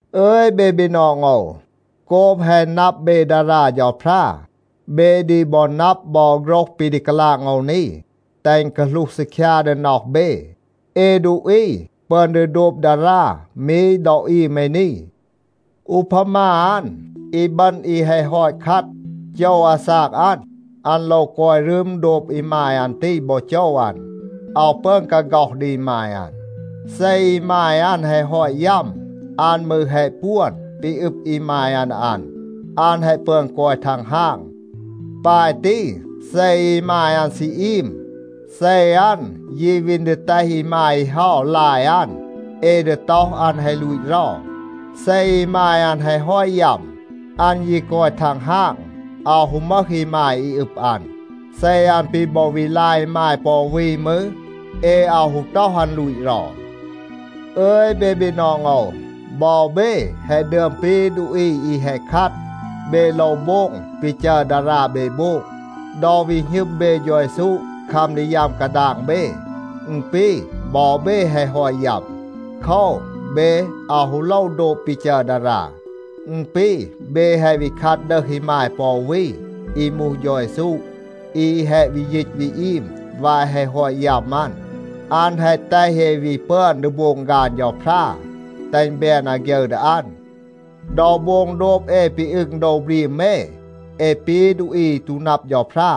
อึย เบ บีนอง โอว, โกบ แฮะ นับ เบ ดารา เฌาพรา, เบ ดี บอ นับ บอ โฆรห ปี ดี กาลาง โอว นี. แตห อึณ กาหลูห ซีคยา ดี น็อห เบ. เอ ดูอี ปึอน ดี โดบ ดารา มี ดอ อีม เอ นี. อูพามา อัน, อีบึณ อี แฮะ ฮอต คัด, โจว อาซาก อัน, อัน โลว กอย รึม โดบ อีมาย อัน ตี บอ โจว อัน. อาว ปึอน กาฆ็อห ดี อีมาย อัน. เซ อีมาย อัน แฮะ ฮอต ยัม, อัน มืร แฮะ ปวน ปี อึบ อีมาย อัน ดี อัน, อัน แฮะ ปึอน กอย ทังฮาง. ปาย ตี, เซ อีมาย อัน ซี อีม, เซ อัน ยี วีน ดี แตห อีมาย อี เฮา ลาย อัน, เอ ดี ต็อห, อัน แฮะ ลูต เรา. เซ อีมาย อัน แฮะ ฮอต ยัม, อัน ยี กอย ทังฮาง, อาว ฮู มึห อีมาย อี อึบ อัน. เซ อัน ปี บอ วี ลาย อีมาย ปอ อู วี มืร, เอ อาว ฮู ต็อห, อัน ลูต เรา. อึย เบ บีนอง โอว, บอ เบ แฮะ ดึอม ปี ดูอี อี แฮะ คัด. เบ โลว โบง ปี จัร ดารา เบ โบง. ดอ วี หณึม เบ เฌา เยซู คัม ดี ยัม กาดาง เบ, อึณ ปี บอ เบ แฮะ ฮอต ยัม. โคว, เบ อาว ฮู โลว โดบ ปี จัร ดารา. อึณ ปี เบ แฮะ วี คัด ดึห อีมาย ปอ อู วี อี มูห เฌา เยซู อี แฮะ วี ยีต วี อีม วาย แฮะ ฮอต ยัม อัน. อัน แฮะ แตห เอ วี ปึอน ดี โบง ฆาน เฌาพรา, แตห อึณ แบน อาฆยึร ดี อัน. ดอ โบง โดบ เอ ปี อึง โดว บรีม เอ, เอ ปี ดูอี อี ตู นับ เฌาพรา.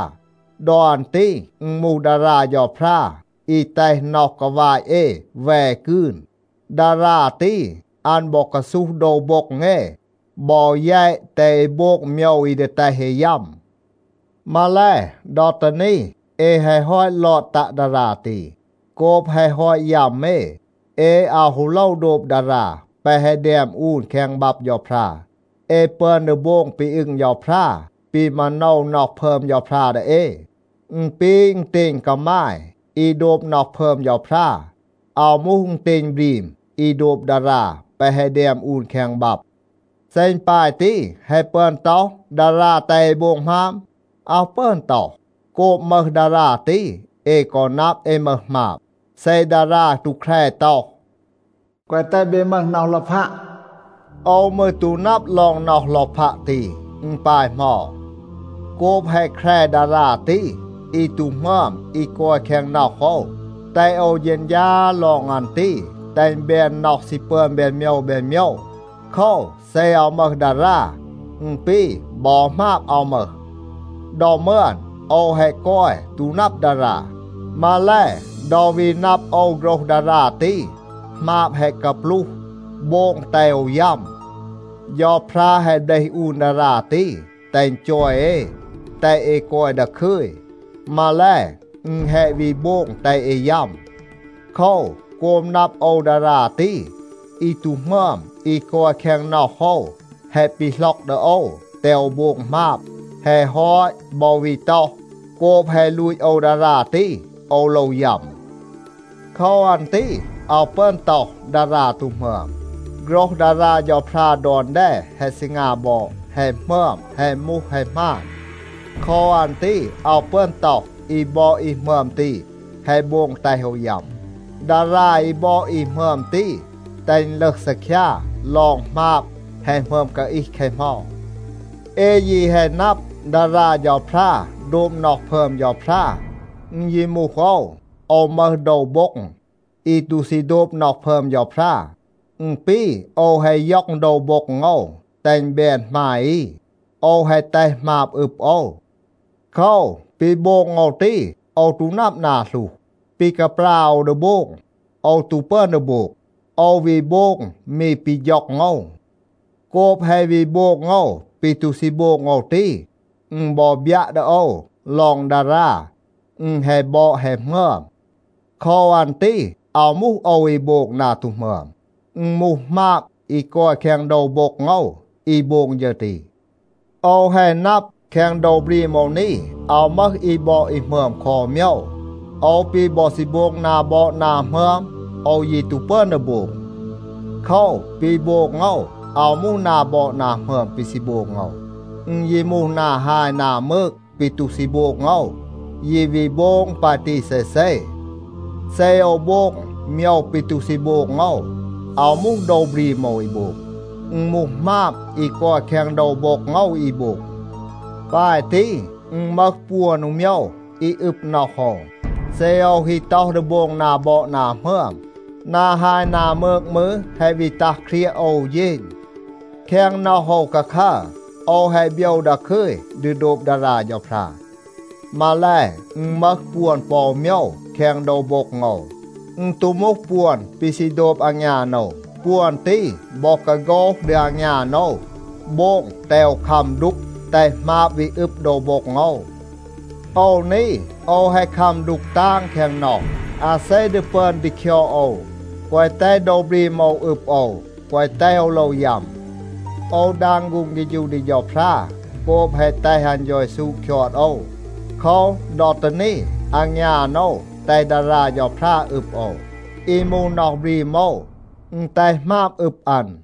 ดอ อัน ตี อึณ มูห ดารา เฌาพรา อี แตห น็อห กาวาต เอ แว กืน. ดารา ตี, อัน บอ กาซูห โดว โบ็ง เอ บอ แยต แตห เอ โบง โมยว อี ดี แตห เอ ยัม. มาแล, ดอ ตี นี เอ แฮะ ฮอต ลอด ตัะ ดารา ตี. โกบ แฮะ ฮอต ยัม เอ, เอ อาว ฮู โลว โดบ ดารา แปะ แฮะ แดม อูน แคง บับ เฌาพรา. เอ ปึอน ดี โบง ปี อึง เฌาพรา, ปี มาโนว น็อห พึอม เฌาพรา ดี เอ. อึณ ปี อึณเตณ กามาย อี โดบ น็อห พึอม เฌาพรา. อาว มูห อึณเตณ บรีม อี โดบ ดารา แปะ แฮะ แดม อูน แคง บับ. เซ อึณ ปาย ตี, แฮะ ปึอน ต็อห, ดารา แตห เอ โบง หมาบ? อาว ปึอน ต็อห. โกบ มึห ดารา ตี, เอ กอ นับ, เอ มึห หมาบ. เซ ดารา ตู แคร ต็อห, “แกวะ แตห เบ มึห น็อห ลอพัะ,” โอว มืร ตู นับ ลอง น็อห ลอพัะ ตี, อึณ ปาย เหมา. โกบ แฮะ แคร ดารา ตี, อี ตู หมึอม อี กอย แคง น็อห โอว, แตห โอว เฌณฌา ลอง อัน ตี, แตห อึณ แบน น็อห ซี ปึอน แบน โมยว แบน โมยว. โคว, เซ อาว มึห ดารา, อึณ ปี, บอ หมาบ อาว มึห. ดอ มึอน โอว แฮะ กอย, ตู นับ ดารา. มาแล, ดอ วี นับ โอว โฆรห ดารา ตี, หมาบ แฮะ กาปลูห, โบง แตห โอว ยัม. เฌาพรา แฮะ เบลห อูน ดารา ตี, แตห อึณ จอย เอ, แตห เอ กอย ดาคึย. มาแล, อึณ แฮะ วี โบง แตห เอ ยัม. โคว, โกบ นับ โอว ดารา ตี, อี ตู หมึอม อี กอย แคง น็อห โอว แฮะ ปีหล็อก ดี โอว, แตห โอว โบง หมาบ. แฮะ ฮอต บอ วี ต็อห, โกบ แฮะ ลูต โอว ดารา ตี, โอว โลว ยัม. โคว อัน ตี อาว ปึอน ต็อห, ดารา ตู หมึอม. โฆรห ดารา เฌาพรา ดอน แด แฮะ ซีงา บอด, แฮะ หมึอม, แฮะ มูห แฮะ หมาน. โคว อัน ตี อาว ปึอน ต็อห อี บอด อี หมึอม ตี แฮะ โบง แตห โอว ยัม. ดารา อี บอด อี หมึอม ตี แตห อึณ ลึห ซีคยา ลอง หมาบ แฮะ หมึอม กาอีห แคะ เหมา. เอ ยี แฮะ นับ, ดารา เฌาพรา โดบ น็อห พึอม เฌาพรา. อึณ ยี มูห โอว, โอว มึห โดว โบ็ง อี ตู ซี โดบ น็อห พึอม เฌาพรา. อึณ ปี, โอว แฮะ ย็อง โดว โบ็ง โอว, แตห อึณ แบน หมาย อี. โอว แฮะ แตห หมาบ อึบ โอว. โคว, ปี โบง โอว ตี, โอว ตู นับ นา หลูห. ปี กาปรา โอว ดี โบง, โอว ตู ปึอน ดี โบง. โอว วี โบง มี ปี ฌ็อง โอว. โกบ แฮะ วี โบง โอว ปี ตู ซี โบง โอว ตี, อึณ บอ บยัะ ดี โอว ลอง ดารา, อึณ แฮะ บอด แฮะ หมึอม. โคว อัน ตี อาว มูห โอว อี โบง นา ตู หมึอม. อึณ มูห หมาบ อี กอย แคง โดว โบ็ง โอว อี โบง ฌึร ตี. โอว แฮะ นับ แคง โดว บรีม โอว นี, อาว มึห อี บอด อี หมึอม คอ อู โมยว. โอว ปี บอ ซี โบง นา บอด นา หมึอม, โอว ยี ตู ปึอน ดี โบง. โคว, ปี โบง โอว อาว มูห นา บอด นา หมึอม ปี ซี โบง โอว, อึณ ยี มูห นา ฮาย นา มืก ปี ตู ซี โบง โอว, ยี วี โบง ปาย ตี เซเซ. เซ โอว โบง โมยว ปี ตู ซี โบง โอว, อาว มูห โดว บรีม โอว อี โบง. อึณ มูห หมาบ อี กอย แคง โดว โบ็ง โอว อี โบง. ปาย ตี, อึณ มึห ปวน อู โมยว อี อึบ น็อห โอว. เซ โอว ฮี ต็อห ดี โบง นา บอด นา หมึอม, นา ฮาย นา มืก มืร แฮะ วี ตัห เครียะ โอว อู เฌณ. แคง น็อห โอว คาคัร, โอว แฮะ โบยว ดาคึย ดี โดบ ดารา เฌาพรา. มาแล, อึณ มึห ปวน ปอ อู โมยว แคง โดว โบ็ง โอว. อึณ ตู มูห ปวน ปี ซี โดบ อางยาน โอว. ปวน ตี บอ กาโฆห ดี อางยาน โอว, โบง แตห โอว คัม ดูก, แตห หมาบ วี อึบ โดว โบ็ง โอว. โอว นี, โอว แฮะ คัม ดูก ตาง แคง น็อห. อาเซ ดี ปึอน ดี คยอด โอว, แกวะ แตห โดว บรีม โอว อึบ โอว, แกวะ แตห โอว โลว ยัม? โอว ดาง ฆูง เฆฌู ดี เฌาพรา โกบ แฮะ แตห อัน เฌา เยซู คยอด โอว. โคว, ดอ ตี นี, อางยาน โอว แตห ดารา เฌาพรา อึบ โอว. อี มูห น็อห บรีม โอว, อึณ แตห หมาบ อึบ อัน.